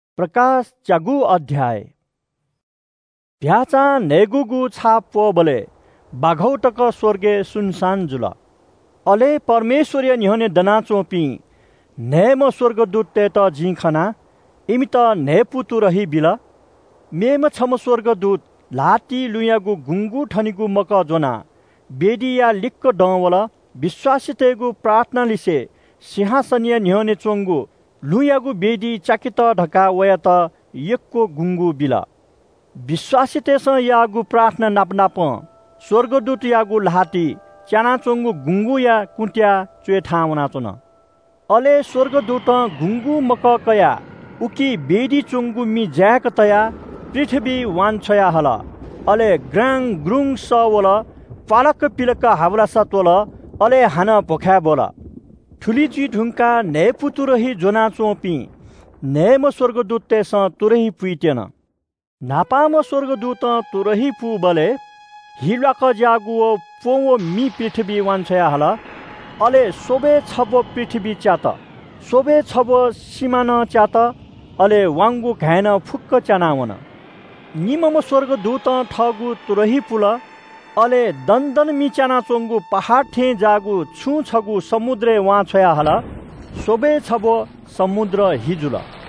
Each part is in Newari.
चीधिकःम्‍ह भ्‍याःचां न्‍हय्‌गूगु छाप प्‍वःबलय् बाघौ तक स्‍वर्गय् सुनसान जुल। अले परमेश्‍वरया न्‍ह्यःने दनाच्‍वंपिं न्‍हय्‌म्‍ह स्‍वर्गदूततय्‌त जिं खना। इमित न्‍हय्‌पु तुरही बिल। मेम्‍ह छम्‍ह स्‍वर्गदूत ल्‍हातिइ लुँयागु गुँगू थनीगु मकः ज्‍वनाः वेदीया लिक्‍क दं वल। विश्‍वासीतय्‌गु प्रार्थनालिसें सिंहासनया न्‍ह्यःने च्‍वंगु लुँयागु वेदीइ च्‍याकेत धकाः वयात यक्‍व गुँगू बिल। विश्‍वासीतय्‌सं याःगु प्रार्थना नापनापं स्‍वर्गदूतयागु ल्‍हातिइ च्‍यानाच्‍वंगु गुँगूया कुँत्‍याः च्‍वय् थाहां वनाच्‍वन। अले स्‍वर्गदूतं गुँगू मकः कयाः उकी वेदीइ च्‍वंगु मि जाय्‌क तयाः पृथ्‍वीइ वान्‍छ्वया हल। अले ग्राङ्‌गग्रुङ्‌ग सः वल प्‍वालाक्‍क पिलाक हावलासा त्‍वल। अले हानं भ्‍वखाय् ब्‍वल। थुलि जुइ धुंकाः न्‍हय्‌पु तुरही ज्‍वनाच्‍वंपिं न्‍हय्‌म्‍ह स्‍वर्गदूततय्‌सं तुरही पुइत्‍यन। न्‍हापांम्‍ह स्‍वर्गदूतं तुरही पूबलय् हि ल्‍वाकज्‍याःगु प्‍वँ व मि पृथ्‍वीइ वान्‍छ्वया हल। अले स्‍वब्‍वय् छब्‍व पृथ्‍वी च्‍यात, स्‍वब्‍वय् छब्‍व सिमा नं च्‍यात, अले वाउँगु घाँय् नं फुक्‍क च्‍यानाः वन। निम्‍हम्‍ह स्‍वर्गदूतं थःगु तुरही पुल। अले दनदन मि च्‍यानाच्‍वंगु पहाड थें ज्‍याःगु छुं छगू समुद्रय् वान्‍छ्वया हल। स्‍वब्‍वय् छब्‍व समुद्र हि जुल।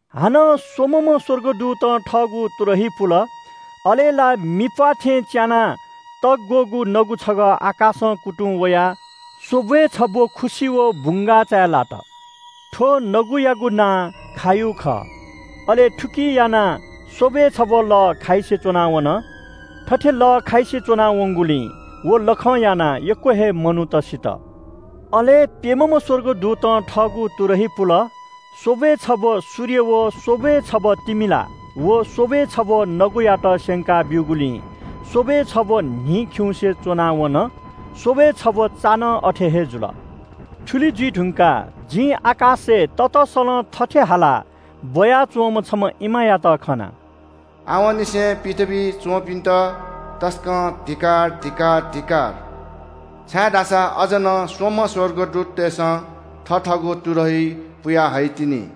हानं स्‍वम्‍हम्‍ह स्‍वर्गदूतं थःगु तुरही पुल। अले ला मिप्‍वाः थें च्‍यानाः तःग्‍वःगु नगु छगः आकाशं कुतुं वयाः स्‍वब्‍वय् छब्‍व खुसि व बुंगाःचाय् लात। थ्‍व नगुयागु नां “खायु” खः। अले थुकिं यानाः स्‍वब्‍वय् छब्‍व लः खाइसे च्‍वना वन। थथे लः खाइसे च्‍वना वंगुलिं व लखं यानाः यक्‍व हे मनूत सित। अले प्‍यम्‍हम्‍ह स्‍वर्गदूतं थःगु तुरही पुल। स्‍वब्‍वय् छब्‍व सूर्य व स्‍वब्‍वय् छब्‍व तिमिला व स्‍वब्‍वय् छब्‍व नगुयात स्‍यंका ब्‍यूगुलिं स्‍वब्‍वय् छब्‍व न्‍हि खिउँसे च्‍वना वन, स्‍वब्‍वय् छब्‍व चा नं अथे हे जुल। थुलि जुइ धुंकाः जिं आकाशय् ततसलं थथे हालाः ब्‍वया च्‍वंम्‍ह छम्‍ह इमायात खना। “आवंनिसें पृथ्‍वीइ च्‍वंपिन्‍त तसकं धिक्‍कार, धिक्‍कार, धिक्‍कार, छाय्‌धाःसा अझ नं स्‍वम्‍ह स्‍वर्गदूततय्‌सं थथःगु तुरही पुयाहइतिनि।”